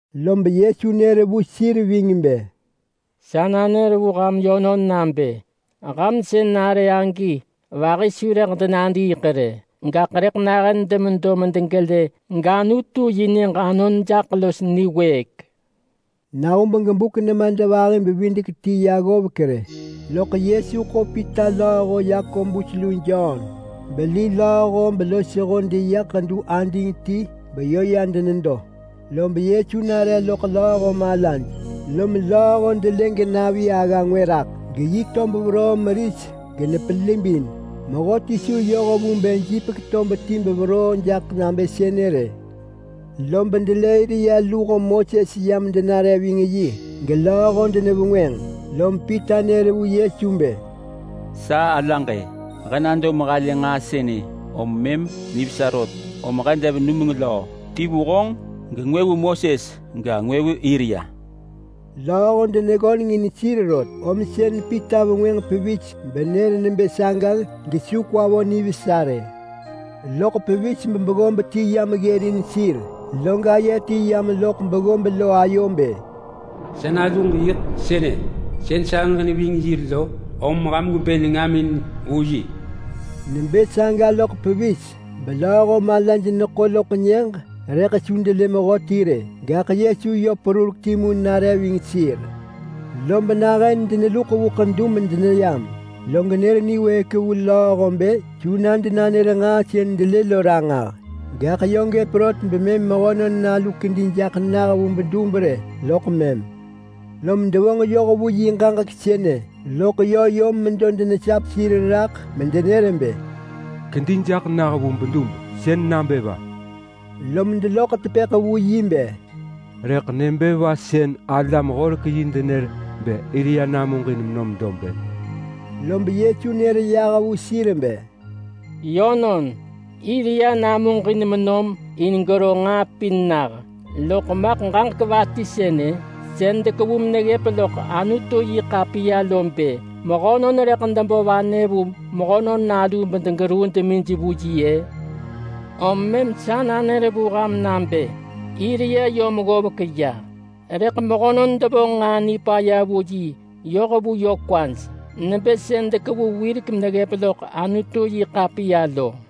Lob Yesu nër vu sir ving bë, “Sa nanër vu ham yönon nabë: Ham sën nare agi vahi su rëḳ denadiiḳ rë, gaḳ rëḳ nahën demedo medegelë gAnutu yi nyëġ anon jaḳ los niwëëk.” Nahub gebuk nemadvahi-bevidek-ti ya ggovek rë, loḳ Yesu ḳo Pita lööho Yakobus lu Jon beli lööho belosho deya ḳedu ading ti beyö ya denedo. Lob Yesu nare loḳ lööho malaj, lom lööho delë genavi agga ngwë raḳ, geyi tob veroo meris genepelibin, mehöti su yoh vu bë jipek tob ti meveroo jaḳ nabë sënë rë. Lob delë Elia luho Moses yam denare ving yi gelööho denevengwënġ. Lom Pita nër vu Yesu bë, “Sa alaġ-e! He nado mehalë nġaa sënë om mëm nivesa rot, om he dev numeng löö, ti vu honġ, gengwë vu Moses ga, ngwë vu Elia.” Lööho deneggöneng in sir rot, om sën Pita vengwënġ pevis benër nebë saga gesu kwa vo nivesa rë. Loḳ pevis bebeggob ti yam ggërin sir, log aye ti yam loḳ beggob lo ayo bë, “Sa naluġ yiḳ sënë sën sahëġ neving yi lo, om ham gwebë nengamin vu yi.” Nebë saga loḳ pevis belööho malaj neḳo loḳ nyëġ rëḳ su delë mehöti rë. Gaḳ Yesu perurek timu yö nare ving sir. Lob nahën deneluḳ medeneyam vu ḳedu genër niwëëk vu lööho bë su denanër nġaa sën delë lo ranġah. Gaḳ yö gëp rot bemëm Mehönon Nalu kedi jaḳ nah vu bedub rë, loḳ mëm. Lom devonġ yoh vu yi ġaġek sënë, loḳ yö yom medo denesap sir raḳ medenër bë, “Kedi jaḳ nah vu bedub sën nabë va?” Lom deloḳ tepëḳ vu yi bë, “Rëḳ nebë va sën alam-horek-yi denër bë Elia namuġin menom dob-ë?” Lob Yesu nër yah vu sir bë, “Yönon, Elia namuġin menom in gero nġaa pin nah. Loḳ maḳ ġaġek va ti sënë sën dekevu meneggëp loḳ Anutu-yi-ḳapiya bë mehönon rëḳ debo vanë vu Mehönon Nalu bedegeruu demij vu yi-ë? Om mëm sa nanër vu ham nabë Elia yom ggovek, rëḳ mehönon devonġ nġaa nipaya vu yi yoh vu yö kwaj, nebë sën dekevu wirek meneggëp loḳ Anutu-yi-ḳapiya lo.”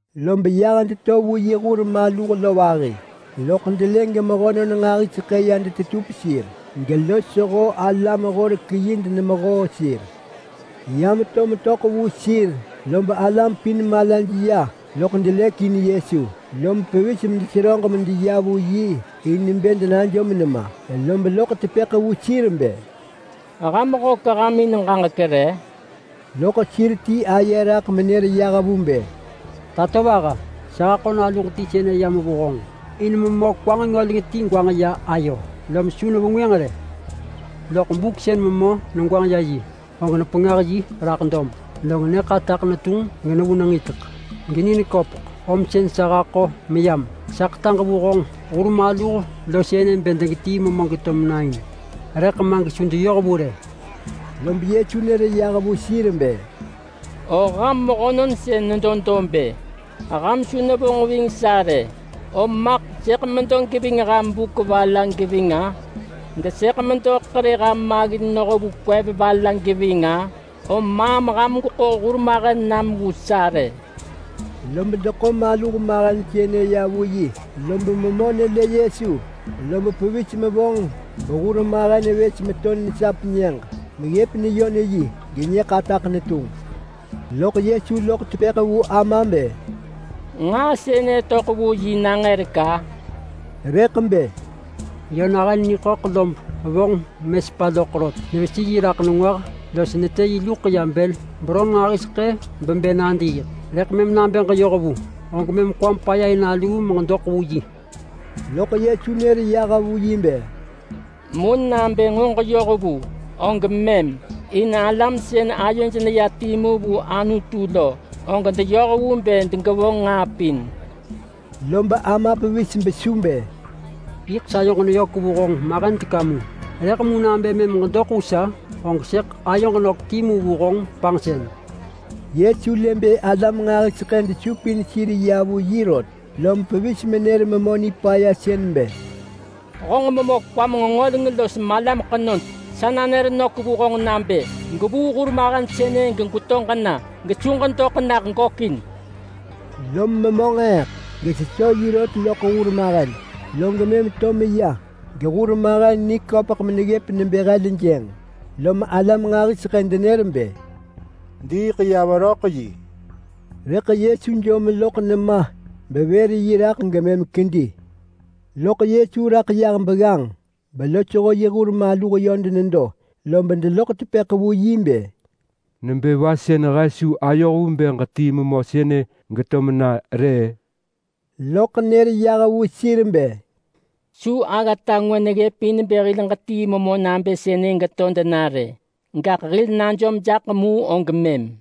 Lob yah deto vu yi hur maluh vahi lo, lob delë gemehönon nġahiseḳë ya detetup sir, gelosho alam-horek-yi denemehoo sir. Ya meto detöḳ vu sir, lob alam pin delë Yesu bedelëk in yi, lom pevis medeseröġ medeya vu yi in bë denajom nema. Lob loḳ tepëḳ vu sir bë, “Ham hök ham in ġaġek re?” Loḳ sir ti aye raḳ menër yah vu bë, “Tatovaha! Sa haḳo naluġ ti sën yam vu honġ in memö kwa nġengöleng ti gwanġ ya ayo, lom su nevengwënġ rë. Loḳ buk sën memö negwanġ ya yi, og nepengah yi raḳ dob, log nyë ḳataḳ netunġ genevu nengitek geni neköpeḳ, om sën sa haḳo meyam. Sa ḳetaġ vu honġ hur maluh sënë bë degetii memö geto mena in, rëḳ ma gesu deyoh vu rë.” Lob Yesu nër yah vu sir bë, “O ham mehönon sën nedo dob-ë! Ham su nevonġ ving sa rë! Om maḳ sëḳ medo geving ham buk va la geving-a? Gesëḳ medo ḳerë ham maggin noh vu kwev va la geving-a? Om maam ham gweḳo hurmahen nam vu sa rë!” Lob deḳo maluh mahen sënë ya vu yi, lob memö nelë Yesu, lob pevis mevonġ behurmahen vës meto nesap nyëġ meggëp neyon yi genyë ḳataḳ netunġ. Loḳ Yesu loḳ tepëḳ vu ama bë, “Nġaa sënë töḳ vu yi nangërek-a?” Rëḳ bë, “Yö nahën niḳöḳ lob vonġ, genevonġ menesepa loḳ rot. Nevesi yi raḳ nengwah los netë yi luḳ ya bël beron nġahiseḳë bebë nadiiḳ. Rëḳ mëm nabë ġeyoh vu, og mëm kwam paya in aluu meġedoḳ vu.” Loḳ Yesu nër yah vu yi bë, “Mu nabë nġo ġeyoh vu, og mëm! In alam sën ayoj neya timu vu Anutu lo, og deyoh vu bë degevonġ nġaa pin.” Lob ama pevis besu bë, “Yiḳ sayoġ neyök vu honġ mahen teka mu, rëḳ mu nabë mëm ġedoḳ vu sa, og sëḳ ayoġ nök timu vu honġ panġsën.” Yesu lë bë alam nġahiseḳë desupin sir ya vu yi rot, lom pevis menër memö nipaya sën lo bë, “Honġ memö kwam nġengöleng los malam ḳenod! Sa nanër vu honġ nabë: Gwevuu hurmahen sënë gegweto ġena, gesu ġedoḳ nah gökin!” Lob memö nġeeḳ gesesö yi rot loḳ hurmahen, log mëm to meya gehurmahen niköpeḳ meneggëp nebë heljënġ, lom alam nġahiseḳë denër bë, “Diiḳ ya veröḳ yi!” Rëḳ Yesu jom loḳ nema beḳo yi raḳ gemëm kedi raḳ. Log Yesu raḳ yah begganġ belosho yi hur maluh yö denedo, lob deloḳ tepëḳ vu yi bë, “Nebë va sën he su ayoh vu bë ġetii memö sënë geto mena rë-ë?” Loḳ nër yah vu sir bë, “Su aggata ngwë neggëp in bë hil ġetii memö nabë sënë geto dena rë, gaḳ hil najom jaḳ mu og mëm!”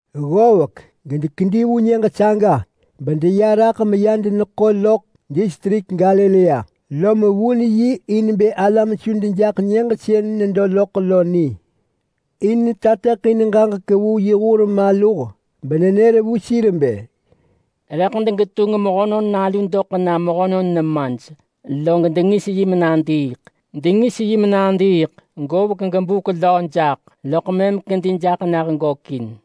Ggovek gedekedi vu nyëġ saga bedeya raḳ meya deneḳo loḳ distrik Galilea, lom vun yi in bë alam su dejaḳ nyëġ sën nedo loḳ lo ni. In netateḳin ġaġek vu yi hur maluh benenër vu sir bë, “Rëḳ degetunġ Mehönon Nalu doḳ na mehönon nemaj, log dengis yi menadiiḳ. Dengis yi menadiiḳ govek gebuk löö jaḳ, loḳ mëm kedi jaḳ nah gökin.”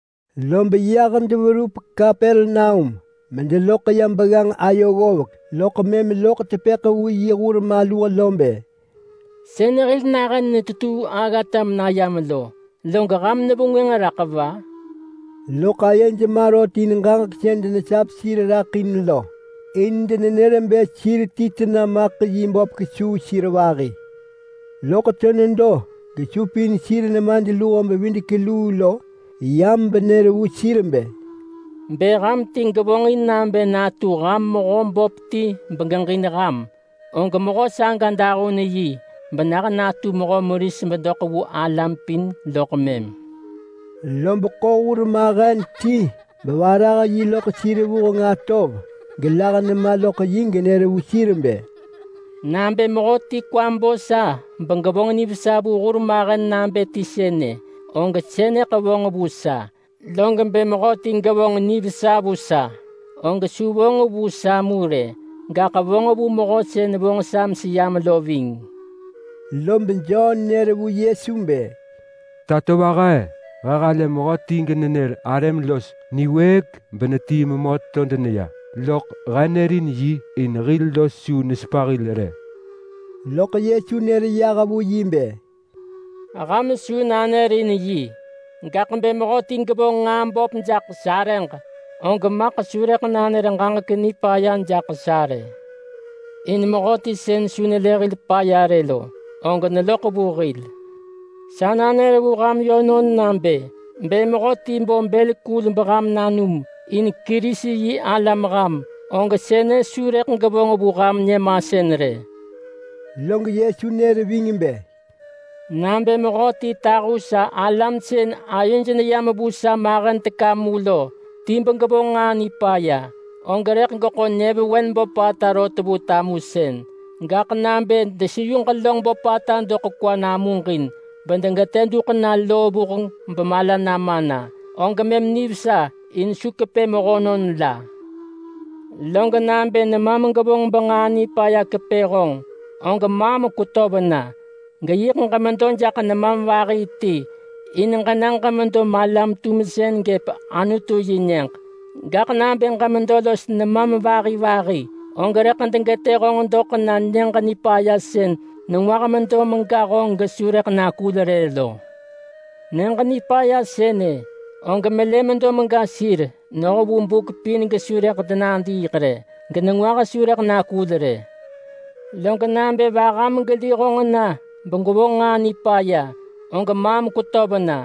Lob yah deverup Kapernaum medeloḳ ya begganġ ayo ggovek, loḳ mëm loḳ tepëḳ vu yi hur maluh lo bë, “Sën hil nahën netetuu aggata menayam lo, log ham nevengwënġ raḳ va?” Loḳ ayej ma rot in ġaġek sën denesap sir raḳ lo. In denenër bë sir ti tena maḳ yi böp kesuu sir vahi. Loḳ to nedo gesupin sir nemadluho-bevidek-luu lo yam benër vu sir bë, “Bë ham ti gevonġin nabë natu ham mehö böp ti begeġin ham, og mehö saga dahun yi benah natu mehö meris bedoḳ vu alam pin loḳ mëm.” Lob ḳo hurmahen ti bevarah yi loḳ sir vuheng atov gelah nema loḳ yi genër vu sir bë, “Nabë mehöti kwa bo sa begevonġ nivesa vu hurmahen nabë ti sënë, og sënëḳ vonġ vu sa; log bë mehöti gevonġ nivesa vu sa, og su vonġ vu sa mu rë, gaḳ vonġ vu Mehö sën vonġ sa meseyam lo ving.” Lob Jon nër vu Yesu bë, “Tatovaha! He halë mehöti genenër arëm los niwëëk benetii memö to deneya, loḳ he nërin yi, in hil los su nesepa hil rë!” Loḳ Yesu nër yah vu yi bë, “Ham su nanërin yi rë! Gaḳ bë mehöti gevonġ nġaa böp jaḳ sarëġ, og maḳ su rëḳ nanër ġaġek nipaya jaḳ sa rë. In mehöti sën su nelë hil paya rë lo, og neloḳ vu hil. Sa nanër vu ham yönon nabë: Bë mehöti bo bël kul beham nanum, in Kerisi-yi-alam ham, og sënë su rëḳ gevonġ vu ham nyëmasën rë.” Log Yesu nër ving bë, “Nabë mehöti tahu sa alam sën ayoj neyam vu sa mahen teka mu lo ti begevonġ nġaa nipaya, og rëḳ geḳo nyëvewen böpata rot vu tamusën. Gaḳ nabë deseyu ġelönġ böpata doḳ kwa namuġin bedegetë duḳ na loo vuheng bemala nama na, og mëm nivesa in su kepë mehönon la. Log nabë nemam gevonġ benġaa nipaya kepë honġ, og maam kwetöv na, geyiḳ ġemedo jaḳ nemam vahi ti in ġena ġemedo malam-tumsën gëp Anutu yi Nyëġ. Gaḳ nabë ġemedo los nemam vahi vahi, og rëḳ degetë honġ doḳ na Nyëġ Nipaya sën nengwah medo mega honġ gesu rëḳ nakul rë lo. [Nyëġ Nipaya sënë, og melë medo mega sir noh vu buk pin gesu rëḳ denadiiḳ rë, genengwah su rëḳ nakul rë.] Log nabë vaham geli honġ na begwevonġ nġaa nipaya, og maam kwetöv na,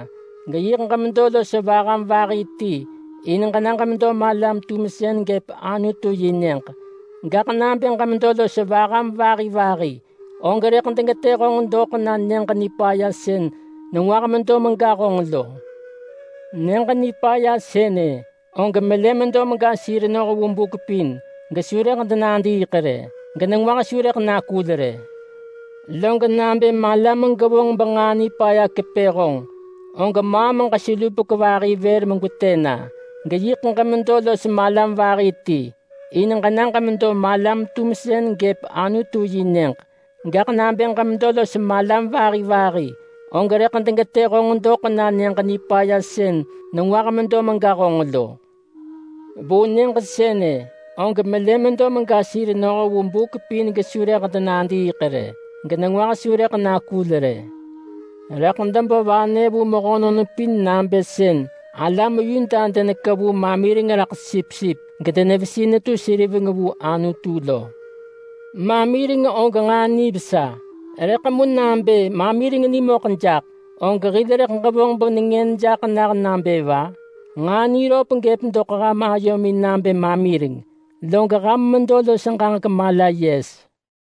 geyiḳ ġemedo los vaham vahi ti in ġena ġemedo malam-tumsën gëp Anutu yi Nyëġ. Gaḳ nabë ġemedo los vaham vahi vahi, og rëḳ degetë honġ doḳ na Nyëġ Nipaya sën nengwah medo mega honġ lo. [Nyëġ Nipaya sënë, og melë medo mega sir noh vu buk pin gesu rëḳ denadiiḳ rë, genengwah su rëḳ nakul rë.] Log nabë malam gevonġ benġaa nipaya kepë honġ, og maam ġeselupek vër megwetë na, geyiḳ ġemedo los malam vahi ti in ġena ġemedo malam-tumsën gëp Anutu yi Nyëġ. Gaḳ nabë ġemedo los malam vahi vahi, og rëḳ degetë honġ doḳ na Nyëġ Nipaya sën nengwah medo mega honġ lo. Vu nyëġ sënë, og ‘melë medo mega sir noh vu buk pin gesu rëḳ denadiiḳ rë, genengwah su rëḳ nakul rë.’ Rëḳ debo vanë vu mehönon pin nabë sën alam Yuda denekevu mamireng raḳ sipsip gedenevesi netu seriveng vu Anutu lo. Mamireng og nġaa nivesa, rëḳ mu nabë mamireng nimöḳ jaḳ, og hil rëḳ ġevonġ benengën jaḳ nah nabë va? Nġaa niröp gëp doḳ ham ayomin nabë mamireng, log ham medo los ġaġek-mala-yes.”